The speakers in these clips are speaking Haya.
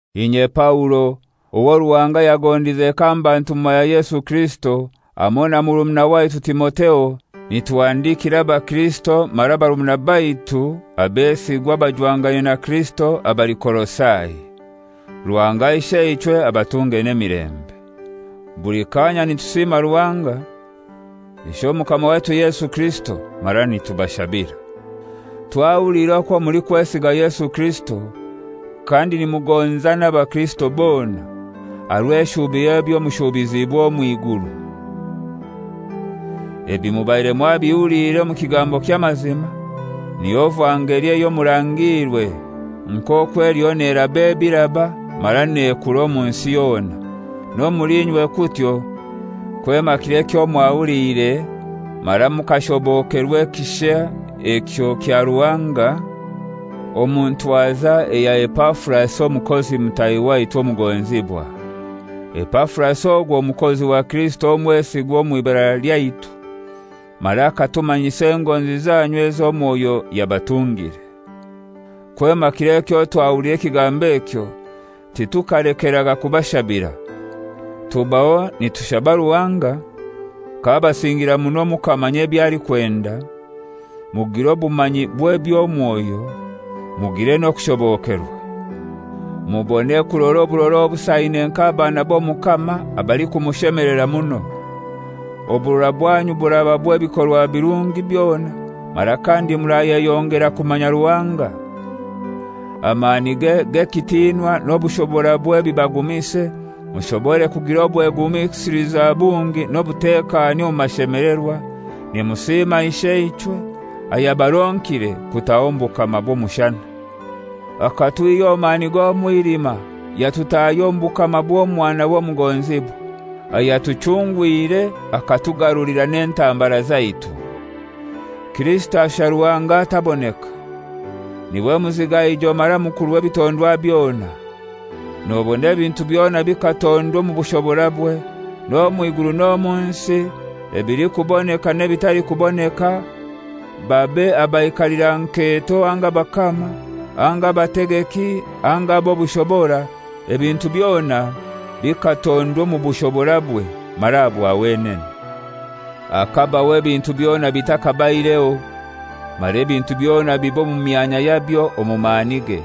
Inye Paulo, owo Ruhanga yagondize kamba ntumwa ya Yesu Kirisito, hamoi na murumuna waitu Timotheo, nituhandikira abakirisito mara barumuna baitu abesigwa abajwangaine na Kirisito, abali Kolosai: Ruhanga Isheichwe abatunge n'emirembe. Buli kanya nitusima Ruhanga, Ishe Omukama waitu Yesu Kirisito, mara nitubashabira. Twahuliire okwo mulikwesiga Yesu Kirisito, kandi nimugonza n'abakirisito bona, aha rw'eshubi y'ebyo mushubizibwe omw'iguru. Ebi mubaire mwabihulire omu kigambo ky'amazima, niyo vangeli eyo mwarangiirwe, nk'okwo eliyo neraba ebiraba mara nekura omu nsi yona, n'omuli inywe kutyo, kwema kiro mwahuliire mara mukashobokerwa ekisha ekyo kya Ruhanga, omu ntwaza eya Epafurasi omukozi mutahi waitu omugonzibwa. Epafurasi ogwo mukozi wa Kirisito omwesigwa omw'ibara lyaitu mara akatumanyisa engonzi zanyu ezo Mwoyo yabatungire. Kwema kiro ekyo twahuliire ekigambo ekyo titukalekeraga kubashabira. Tubaho nitushaba Ruhanga k'abasingira muno mukamanya eby'alikwenda, mugire obumanyi bw'eby'omwoyo, mugire n'okushobokerwa; mubone kurora oburora obusaine nk'abaana b'Omukama abalikumushemelera muno. Oburora bwanyu buraba bw'ebikorwa birungi byona mara kandi murayeyongera kumanya Ruhanga. Amanige g'ekitinwa n'obushoborabwe bibagumise, mushobore kugira obwegumisiliza bungi n'obutekani omu mashemelerwa, nimusiima Isheichwe, ayabaronkire kutaha omu bukama bw'omushana. Akatwihya omu mani g'omwilima yatutahya omu bukama bw'Omwanawe omugonzibwa, ayatuchungwire akatugarulira n'entambara zaitu. Kirisito ashusha Ruhanga ataboneka. Niwe muzigaijo mara mukuru w'ebitondwa byona. Nobona ebintu byona bikatondwa omu bushoborabwe, n'omw'iguru n'omunsi, ebilikuboneka n'ebitalikuboneka, babe abaikalira nketo anga abakama, anga abategeki anga ab'obushobora, ebintu byona bikatondwa omu bushoborabwe mara aha bwa wenene. Akabaho ebintu byona bitakabaireho, mara ebintu byona biba omu myanya yabyo omu manige.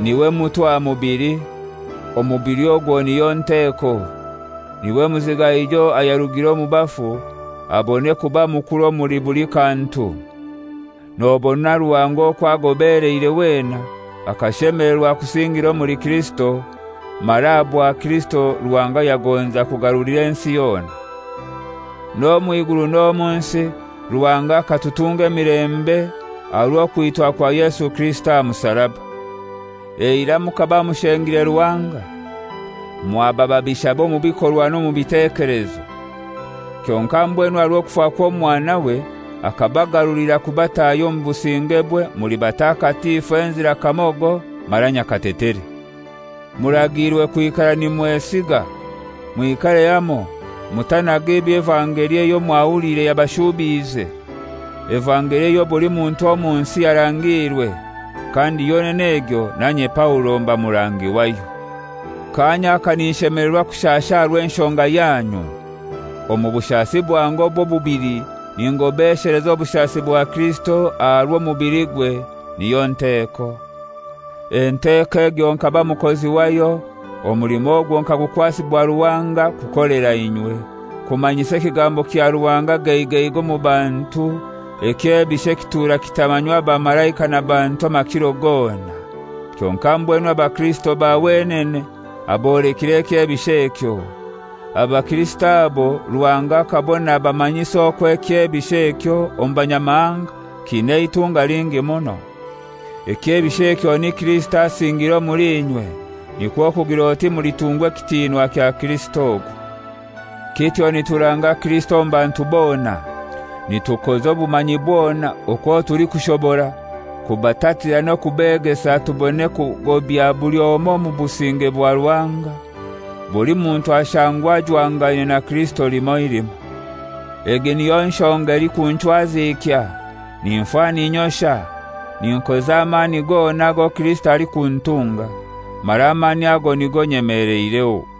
Niwe mutwe aha mubili, omubili ogwo niyo nteko; niwe muzigaijo ayarugire omu bafu, abone kuba mukuru omuli buli kantu. Nobona Ruhanga okwo agobeleire wena akashemelerwa kusingira omuli Kirisito, mara aha bwa Kirisito Ruhanga yagonza kugarulira ensi yona. N'omw'iguru n'omu nsi, Ruhanga akatutunga emilembe aha rw'okwitwa kwa Yesu Kirisito aha musaraba. Eirai mukaba mushengire Ruhanga, mwaba babishabe omu bikorwa n'omu bitekelezo. Kyonkai mbwenu aha rw'okufa kw'Omwanawe akabagarulira kubatahya omu busingebwe muli batakatifu enzira kamogo, mara nyakatetere. Muragiirwe kwikara nimwesiiga, mwikare hamoi, mutanaga eby'evangeli eyo mwahuliire yabashuubiize, evangeli eyo buli muntu omu nsi yarangiirwe, kandi yonene egyo nanye Paulo mba murangi wayo. Kanya aka ninshemelerwa kushasha aha rw'enshonga yanyu, omu bushasi bwange obw'obubili ningobesheleza obushasi bwa Kirisito aha rw'omubiligwe, niyo Nteeko. Enteko egyo nkaba mukozi wayo, omulimo ogwo nkagukwasibwa Ruhanga kukolera inywe, kumanyisa ekigambo kya Ruhanga geigeigei omu bantu, ekyebisho ekitura kitamanywa bamalaika na bantu amakiro gona, kyonkai mbwenu abakirisito ba wenene abolekire ekyebisho ekyo. Abakirisito abo Ruhanga akabona abamanyise okwo ekyebisho ekyo omu Banyamahanga kiina eitunga lingi muno. Ekyebisho ekyo ni Kirisito asingiire omuli inywe, nikwo kugir'oti mulitungwa ekitinwa kya Kirisito ogwo. Kityo nituranga Kirisito omu bantu bona. Nitukoza obumanyi bwona okwo tulikubora kubatatira n'okubegesa tubone kugobya buli omoi omu businge bwa Ruhanga, buli muntu ashangwe ajwangaine na Kirisito limoi limoi. Egi niyo nshonga elikunchwazikya, ninfa ninyosha, ninkoza amani gona ago Kirisito alikuntunga, mara amani ago nigo nyemeleireho.